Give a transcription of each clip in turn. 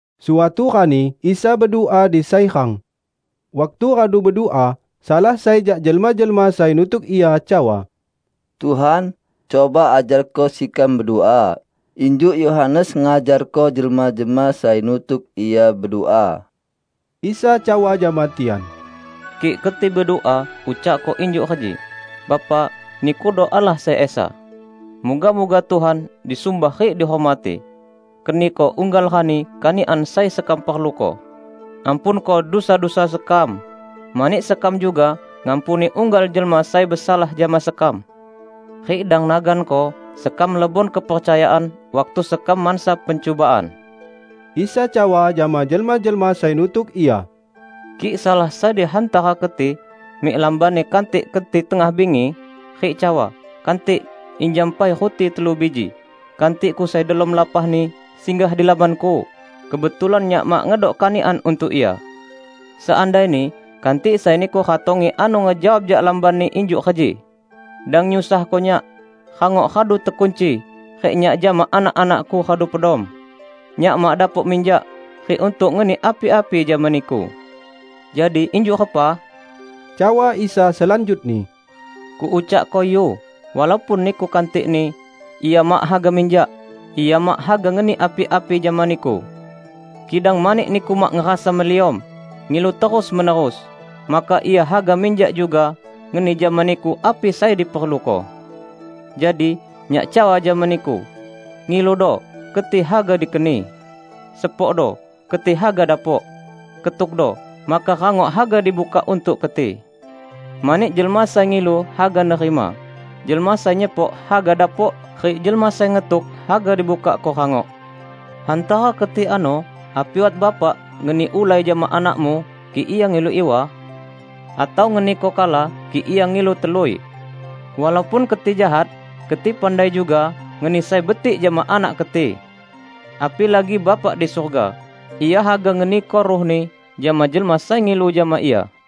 Suatu rani Isa bedua di sai rang. Waktu radu bedua, salah sai jak jelma-jelma sai nutuk Ia cawa, "Tuhan, cuba ajarko sekam bedua injuk Yohanes ngajarko jelma-jelma sai nutuk ia bedua." Isa cawa jama tian, "Kik keti bedua ucakko injuk reji, 'Bapa, Nikudo Allah sai Esa. Muga-muga Tuhan disumbah rik dihormati. Keniko unggal rani kanikan sai sekam perluko. Ampunko dusa-dusa sekam, mani sekam juga ngampuni unggal jelma sai besalah jama sekam. Rik dang naganko sekam lebon kepercayaan waktu sekam mansa pencubaan.' " Isa cawa jama jelma-jelma sai nutuk Ia, "Kik salah sai di hantara keti mik lambanni kantikni keti tengah bingi, rik cawa, 'Kantik, injam pai ruti telu biji, kantikku sai delom lapahni, singgah di lambanku kebetulan nyak mak ngedok kanikan untuk ia!' Seandaini kantik sai niku ratongi ano ngejawab jak lambanni, injuk reji, 'Dang nyusahko nyak! Rangok radu tekunci rik nyak jama anak-anakku radu pedom. Nyak mak dapok minjak rik untuk ngeni api-api jama niku.' " "Jadi injuk repa?" cawa Isa selanjutni, "Kuucakko, yu! Walaupun niku kantikni, ia mak haga minjak, ia mak haga ngeni api-api jama niku. Kidang mani niku mak ngerasa meliom, ngilu terus-menerus, maka ia haga minjak juga ngeni jama niku api sai diperluko. Jadi, Nyak cawa jama niku: Ngiludo, keti haga dikeni; sepokdo, keti haga dapok; ketukdo, maka rangok haga dibukak untuk keti. Mani jelma sai ngilu haga nerima; jelma sai nyepok haga dapok rik jelma sai ngetuk, haga dibukakko rangok. Hantara keti ano api wat bapak ngeni ulai jama anakmu, kik ia ngilu iwa? Atau ngeniko kala, kik ia ngilu telui? Walaupun keti jahat, keti pandai juga ngeni sai betik jama anak keti. Apilagi Bapak di surga! Ia haga ngeniko Ruh-Ni jama jelma sai ngilu jama Ia!"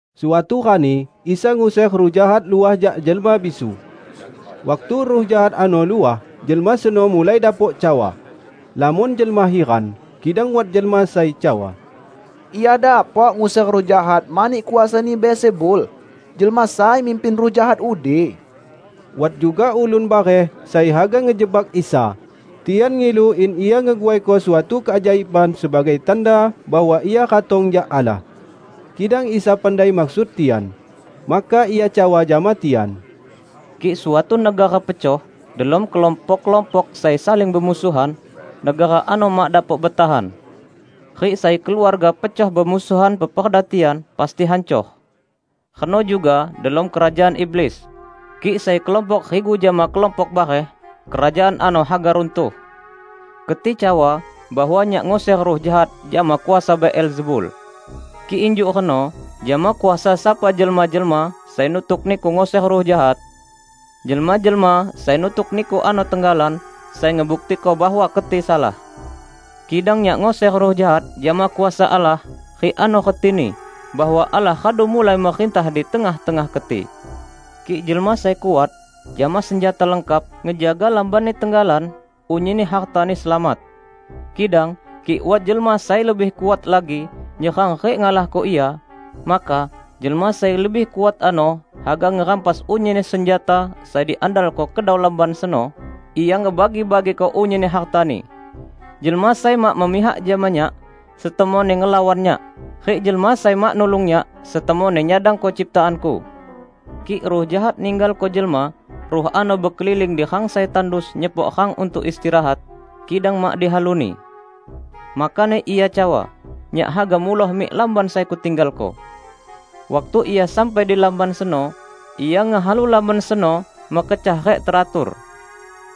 Suatu rani Isa nguser ruh jahat luah jak jelma bisu. Waktu ruh jahat ano luah, jelma seno mulai dapok cawa. Lamon jelma hiran, kidang wat jelma sai cawa, "Ia dapok nguser ruh jahat mani kuasani Beelzebul, jelma sai mimpin ruh jahat udi." Wat juga ulun bareh sai haga ngejebak Isa, tian ngilu in Ia ngeguaiko suatu keajaiban sebagai tanda bahwa Ia ratong jak Allah. Kidang Isa pandai maksud tian. Maka Ia cawa jama tian, "Kik suatu negara pecoh delom kelompok-kelompok sai saling bemusuhan, negara ano mak dapok betahan. Rik sai keluarga pecoh bemusuhan peperda tian pasti hancor. Reno juga delom kerajaan iblis; kik sai kelompok rigu jama kelompok bareh, kerajaan ano haga runtuh. Keti cawa bahwa Nyak nguser ruh jahat jama kuasa Beelzebul. Kik injuk reno, jama kuasa sapa jelma-jelma sai nutuk niku nguser ruh jahat? Jelma-jelma sai nutuk niku ano tenggalan sai ngebuktiko bahwa keti salah! Kidang Nyak nguser ruh jahat jama kuasa Allah, rik ano retini bahwa Allah radu mulai merintah di tengah-tengah keti. Kik jelma sai kuat, jama senjata lengkap, ngejaga lambanni tenggalan, unyinni hartani selamat. Kidang kik wat jelma sai lebih kuat lagi nyerang rik ngalahko ia, maka jelma sai lebih kuat ano haga ngerampas unyinni senjata sai diandalko kedau lamban seno, rik ia ngebagi-bagiko unyinni hartani. Jelma sai mak memihak jama Nyak, setemonni ngelawan Nyak, rik jelma sai mak nulung Nyak setemonni nyadangko ciptaan-Ku!" "Kik ruh jahat ninggalko jelma, ruh ano bekeliling di rang sai tandus nyepok rang untuk istirahat, kidang mak dihaluni. Makani ia cawa, 'Nyak haga muloh mik lamban sai kutinggalko!' Waktu ia sampai di lamban seno, ia ngehalu lamban seno mekecah rik teratur.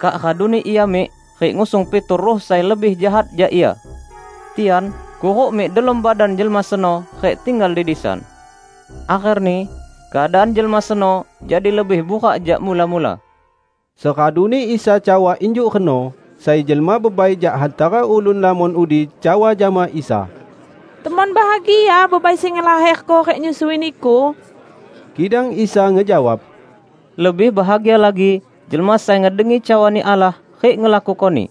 Kak raduni ia mik rik ngusung pitu ruh sai lebih jahat jak ia. Tian kuruk mik delom badan jelma seno rik tinggal di disan. Akherni keadaan jelma seno jadi lebih burak jak mula-mula." Seraduni Isa cawa injuk reno, sai jelma bebai jak hantara ulun lamon udi cawa jama Isa, "Temon bahagia bebai sai ngelaherko rik nyusui Niku!" Kidang Isa ngejawab, "Lebih bahagia lagi jelma sai ngedengi cawani Allah rik ngelakukoni!"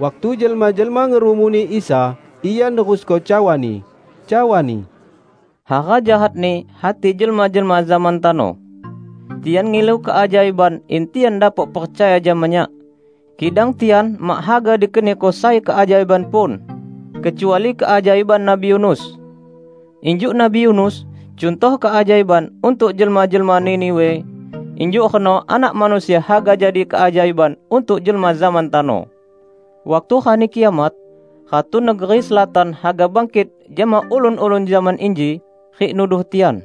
Waktu jelma-jelma ngerumuni Isa, Ia nerusko cawa-Ni, cawa-Ni, "Hara jahatni hati jelma-jelma zaman tano. Tian ngilu keajaiban in tian dapok percaya jama Nyak, kidang tian mak haga dikeniko sai keajaiban pun, kecuali keajaiban Nabi Yunus. Injuk Nabi Yunus cuntoh keajaiban untuk jelma-jelma Niniwe, injuk reno Anak Manusia haga jadi keajaiban untuk jelma zaman tano. Waktu Rani Kiamat, Ratu negeri Selatan haga bangkit jama ulun-ulun zaman inji, rik nuduh tian.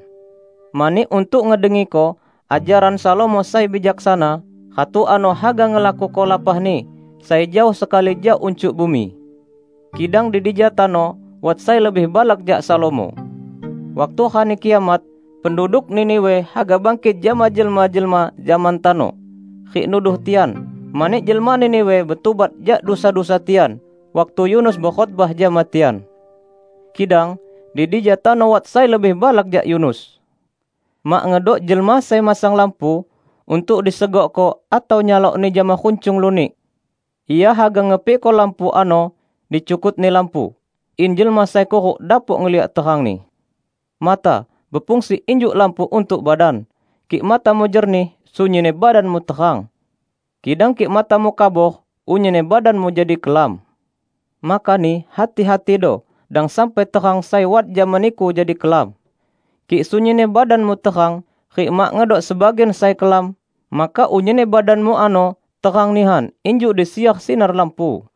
Mani, untuk ngedengiko ajaran Salomo sai bijaksana, Ratu ano haga ngelakuko lapahni sai jaoh sekali jak uncuk bumi. Kidang di dija tano wat sai lebih balak jak Salomo! Waktu Rani Kiamat, penduduk Niniwe haga bangkit jama jelma-jelma zaman tano, rik nuduh tian, mani jelma Niniwe betubat jak dusa-dusa tian waktu Yunus bekhotbah jama tian. Kidang di dija tano wat sai lebih balak jak Yunus!" "Mak ngedok jelma sai masang lampu untuk disegokko atau nyalokni jama runcung lunik. Ia haga ngepikko lampu ano di cukutni lampu, in jelma sai kuruk dapok ngeliak terangni. Mata, befungsi injuk lampu untuk badan. Kik matamu jernih, sunyinni badanmu terang. Kidang kik matamu kabor, unyinni badanmu jadi kelam. Makani, hati-hatido, dang sampai terang sai wat jama niku jadi kelam. Kik sunyinni badanmu terang, rik mak ngedok sebagian sai kelam, maka unyinni badanmu ano terang nihan injuk disiar sinar lampu."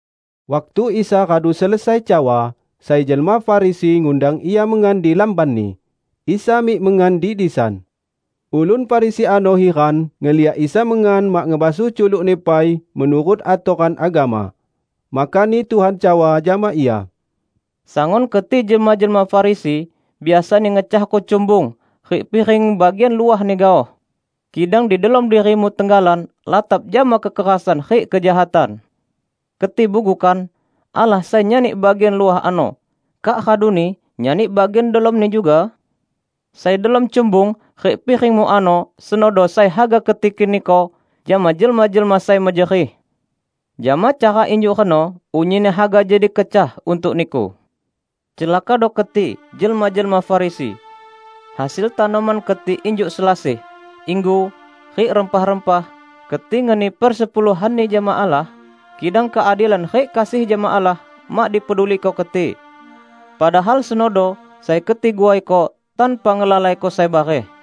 Waktu Isa radu selesai cawa, sai jelma Farisi ngundang Ia mengan di lambanni. Isa mik mengan di disan. Ulun Farisi ano hiran ngeliak Isa mengan mak ngebasuh culuk-Ni pai menurut atoran agama. Makani Tuhan cawa jama ia, "Sangun keti jelma-jelma Farisi, biasani ngecahko cumbung rik piring bagian luahni gaoh, kidang di delom dirimu tenggalan latap jama kekerasan rik kejahatan. Keti bugu kan! Allah sai nyani bagian luah ano, kak raduni nyani bagian delomni juga? Sai delom cumbung rik piringmu ano, senodo sai haga keti keniko jama jelma-jelma sai mejerih. Jama cara injuk reno, unyinni haga jadi kecah untuk niku. Celakado keti, jelma-jelma Farisi! Hasil tanoman keti injuk selasih, inggu rik rempah-rempah, keti ngeni persepuluhanni jama Allah, kidang keadilan rik kasih jama Allah mak dipeduliko keti. Padahal senodo sai keti guaiko tanpa ngelalaiko sai bareh.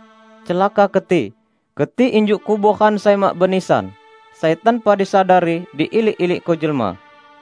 Celaka keti! Keti injuk kuboran sai mak benisan, sai tanpa disadari diilik-ilikko jelma."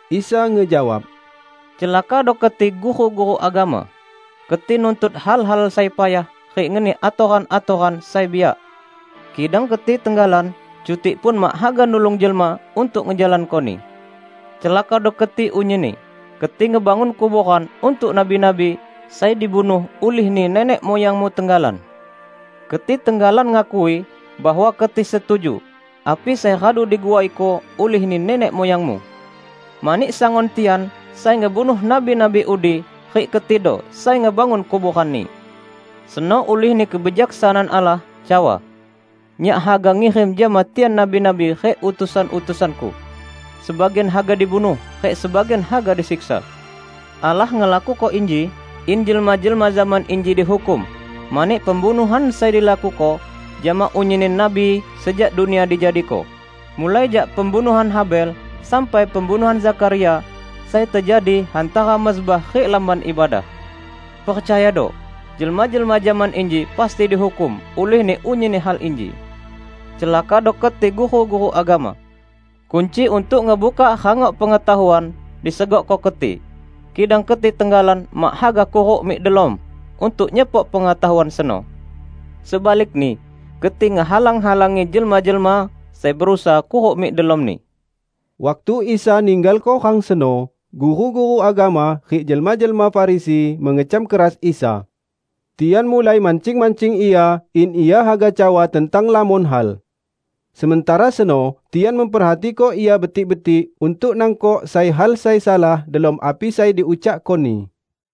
Isa ngejawab, "Celakado keti, guru-guru agama! Keti nuntut hal-hal sai payah rik ngeni atoran-atoran sai biak, kidang keti tenggalan cutikpun mak haga nulung jelma untuk ngejalankoni. Celakado keti unyinni! Keti ngebangun kuboran untuk nabi-nabi, sai dibunuh ulihni nenek muyangmu tenggalan. Keti tenggalan ngakui bahwa keti setuju api sai radu diguaiko ulihni nenek muyangmu; mani sangun tian sai ngebunuh nabi-nabi udi rik ketido sai ngebangun kuboranni. Seno ulihni Kebijaksanaan Allah cawa, 'Nyak haga ngirim jama tian nabi-nabi rik utusan-utusan-Ku; sebagian haga dibunuh rik sebagian haga disiksa.' Allah ngelakuko inji in jelma-jelma zaman inji dihukum mani pembunuhan sai dilakuko jama unyinni nabi sejak dunia dijadiko, mulai jak pembunuhan Habel sampai pembunuhan Zakharia, sai tejadi hantara mezbah rik Lamban Ibadah. Percayado: Jelma-jelma zaman inji pasti dihukum ulihni unyinni hal inji. Celakado keti, guru-guru agama! Kunci untuk ngebukak rangok pengetahuan disegokko keti, kidang keti tenggalan mak haga kuruk mik delom untuk nyepok pengetahuan seno. Sebalikni keti ngehalang-halangi jelma-jelma sai berusaha kuruk mik delomni!" Waktu Isa ninggalko rang seno, guru-guru agama rik jelma-jelma Farisi mengecam keras Isa. Tian mulai mancing-mancing Ia in Ia haga cawa tentang lamon hal. Sementara seno tian memperhatiko Ia betik-betik untuk nangkok sai hal sai salah delom api sai diucakko-Ni.